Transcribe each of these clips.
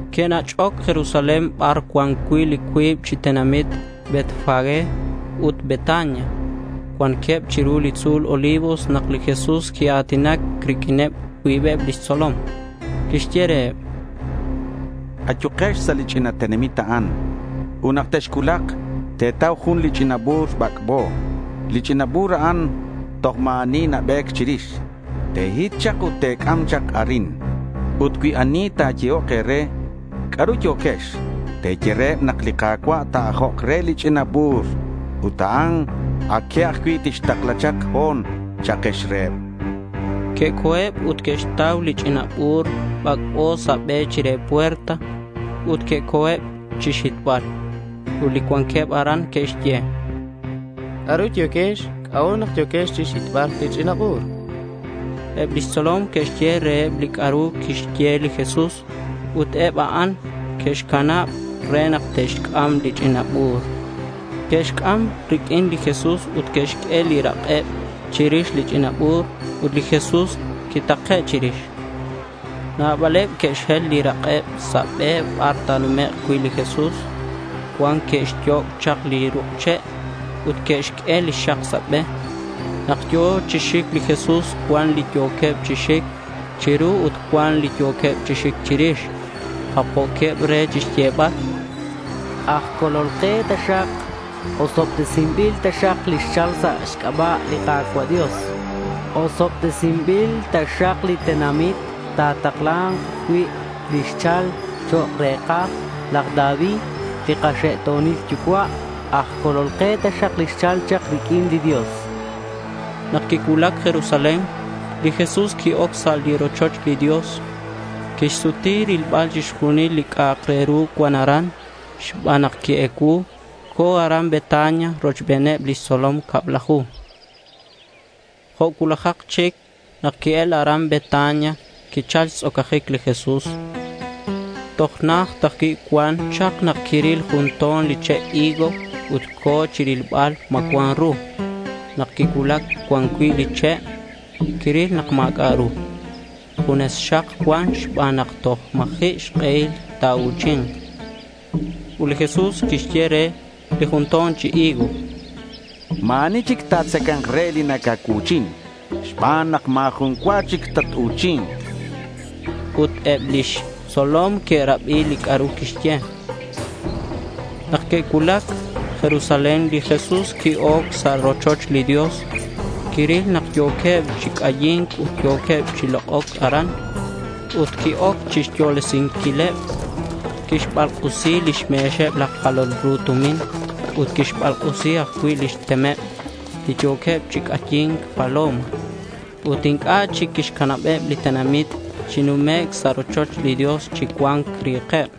Que'nach'oc Jerusalén bar cuan cui' li cuib chi tenamit Betfagé ut Betania. Cuanqueb chiru li tzu̱l Olivos nak li Jesús quia̱tinac riq'uin cuibeb lix tzolom. Quixye reheb: —Ayukex sa' li ch'ina tenamit a'an, ut nak texcuulak, te̱tau jun li ch'ina bu̱r bac'bo. Li ch'ina bu̱r a'an toj ma̱ ani nabe̱c chirix. Te̱hit chak ut te̱c'am chak arin. Ut cui ani nayehoc e̱re, “¿C'a'ru yo̱quex?”, te̱ye reheb nak li Ka̱cua' ta̱ajok re li ch'ina bu̱r ut a que ajcui' tixtakla chak ho̱n, cha'kex reheb.— Que'co̱eb ut que'xtau li ch'ina bu̱r bac'bo sa' be chire puerta. Ut que-oc chixhitbal. Eb li cuanqueb aran que'xye: —¿C'a'ru yo̱quex? ¿C'a'ut nak yo̱quex chixhitbal li ch'ina bu̱r?— Eb lix tzolom que'xye reheb li c'a'ru quixye li Jesús, ut eb a'an que'canaba̱c re nak te'xc'am li ch'ina bu̱r. Que'xc'am riq'uin li Jesús ut que'xq'ue li rak'eb chirix li ch'ina bu̱r ut li Jesús quitake' chirix. Nabaleb que'xhel li rak'eb sa' be bar ta̱numek' cui' li Jesús. Cuan que'xyoc' chak ruk' che' ut que'xq'ue li xak sa' be. Nak yo̱ chi xic li Jesús cuan li yo̱queb chi xic chiru ut cuan li yo̱queb chi xic chirix. Japjo̱queb re chixyebal: —¡Aj Colol ke taxak! ¡Osobtesinbil taxak li xchal sa' xc'aba' li Ka̱cua' Dios! Osobtesinbil taxak li tenamit ta̱takla̱nk cui' li xchal chok' re̱kaj laj David li kaxe'to̱nil yucua'. Aj Colol ke taxak li xchal chak riq'uin li Dios,— chanqueb. Nak quicuulac Jerusalén, li Jesús qui-oc sa' li rochoch li Dios. Quixsuti rilbal chixjunil li c'a'ak re ru cuan aran. Xban nak qui-ecuu co̱ aran Betania rochbeneb lix tzolom cablaju. Jo' cuulajak chic nak que'el aran Betania, quichal xtz'ocajic li Jesús. Toj najt ajcui' cuan chak nak quiril jun to̱n li che' higo ut co̱ chirilbal ma cuan ru. Nak quicuulac cuan cui' li che' quiril nak ma̱c'a' ru. Junes xak cuan xban nak toj ma̱ji' xk'ehil ta̱u̱chi̱nk. Ut li Jesús quixye re li jun to̱n chi higo: —Ma̱ ani chic ta̱tzaca̱nk re li nacacuu̱chin xban nak ma̱ jun cua chic tatu̱chi̱nk, chan. Ut eb lix tzolom que'rabi li c'a'ru quixye. Nak que'cuulac Jerusalén, li Jesús qui-oc sa' li rochoch li Dios. Quiril nak yo̱queb chi c'ayi̱nc ut yo̱queb chi lok'oc aran. Qui-oc chixyolesinquileb. Quixbalk'usi lix me̱xeb laj jalol tumin ut quixbalk'usi ajcui' lix temeb li yo̱queb chi c'ayi̱nc paloma. Ut inc'a' chic quixcanabeb li tenamit chi numec' sa' rochoch li Dios chi cuan ri̱keb.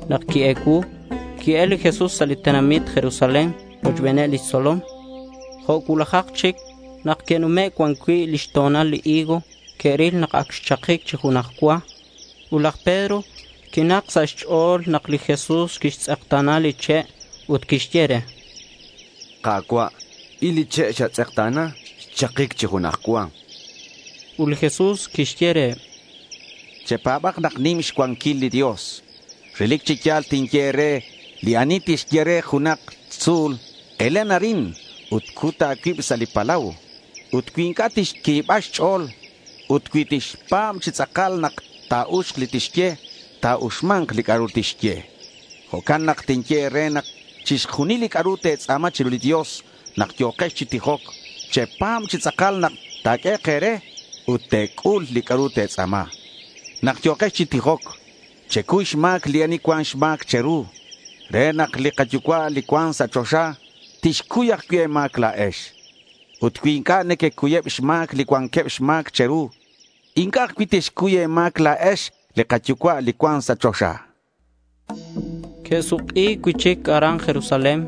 Nak qui-ecuu, qui-el li Jesús sa' li tenamit Jerusalén rochbeneb lix tzolom. Jo' cuulajak chic nak que'nume' cuan cui' li xto̱nal li higo, que'ril nak ac xchakic chi junaj cua. Ut laj Pedro quinak sa' xch'o̱l nak li Jesús quixtz'ekta̱na li che' ut quixye re: —Ka̱cua', il li che' li xatz'ekta̱na. Xchakic chi junaj cua.— Ut li Jesús quixye reheb: —Chepa̱b nak nim xcuanquil li Dios. Relic chi ya̱l tinye e̱re li ani tixye re junak tzu̱l, “Elen arin ut cut a̱cuib sa' li palau”, ut cui inc'a' tixcuiba xch'o̱l, ut cui tixpa̱b chi tz'akal nak ta̱uxk li tixye, ta̱uxma̱nk li c'a'ru tixye. Jo'can nak tinye e̱re nak chixjunil li c'a'ru te̱tz'a̱ma chiru li Dios nak yo̱quex chi tijoc, chepa̱b chi tz'akal nak ta̱q'uehek' e̱re ut te̱c'ul li c'a'ru te̱tz'a̱ma. Nak yo̱kex chi tijoc, checuy xma̱c li ani cuan xma̱c che̱ru re nak li kaYucua' li cuan sa' choxa tixcuy ajcui' e̱ma̱c la̱ex. Ut cui inc'a' nequecuyeb xma̱c li cuanqueb xma̱c che̱ru, inc'a' ajcui' tixcuy e̱ma̱c la̱ex li kaYucua' li cuan sa' choxa, chan li Jesús. Que'suk'i cui'chic aran Jerusalén.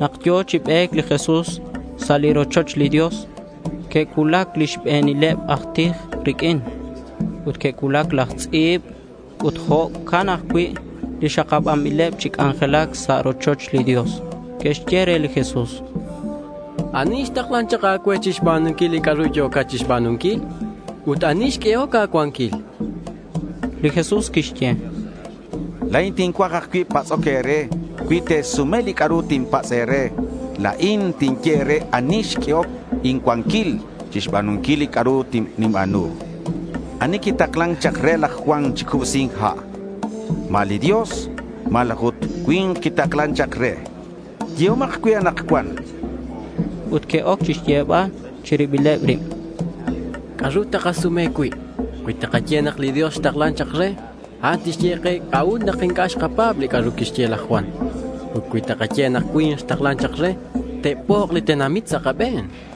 Nak yo̱ chi be̱c li Jesús sa' li rochoch li Dios que'cuulac li xbe̱nileb aj tij riq'uin. Ut que'cuulac laj tz'i̱b ut jo'can ajcui' li xakabanbileb chi c'anjelac sa' li rochoch li Dios. Que'xye re li Jesús: —¿Ani xtaklan chak a̱cue chixba̱nunquil li c'a'ru yo̱cat chixba̱nunquil? Ut ¿ani xq'uehoc a̱cuanquil? chanqueb. Li Jesús quixye: —La̱in tincuaj ajcui' patz'oc e̱re. Cui te̱sume li c'a'ru tinpatz' e̱re, la̱in tinye e̱re ani xq'uehoc incuanquil chixba̱nunquil li c'a'ru ninba̱nu. ¿Ani quitaklan chak re laj Juan chi cubsi̱nc ha'? ¿Ma li Dios malaj ut cui̱nk quitaklan chak re? Yehomak cue anakcuan, chan reheb. Ut que'oc chixyebal chi ribileb rib: —¿C'a'ru takasume cui'? Cui takaye nak li Dios xtaklan chak re, a'an tixye ke c'a'ut nak inc'a' xkapa̱b li c'a'ru quixye laj Juan. Ut cui takaye nak cui̱nk xtaklan chak re, te'pok' li tenamit sa' kabe̱n, chanqueb.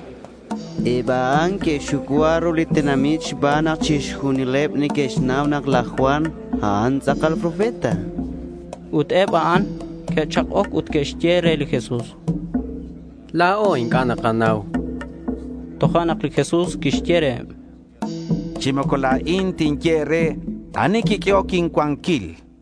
Eb a'an que'xxucua ru li tenamit xban nak chixjunileb neque'xnau nak laj Juan, a'an tz'akal profeta. Ut eb a'an que'chak'oc ut que'xye re li Jesús: —La̱o inc'a' nakanau, chanqueb. Tojo'nak li Jesús quixye reheb: —Chi moco la̱in tinye e̱re ani quiq'uehoc incuanquil, chan reheb.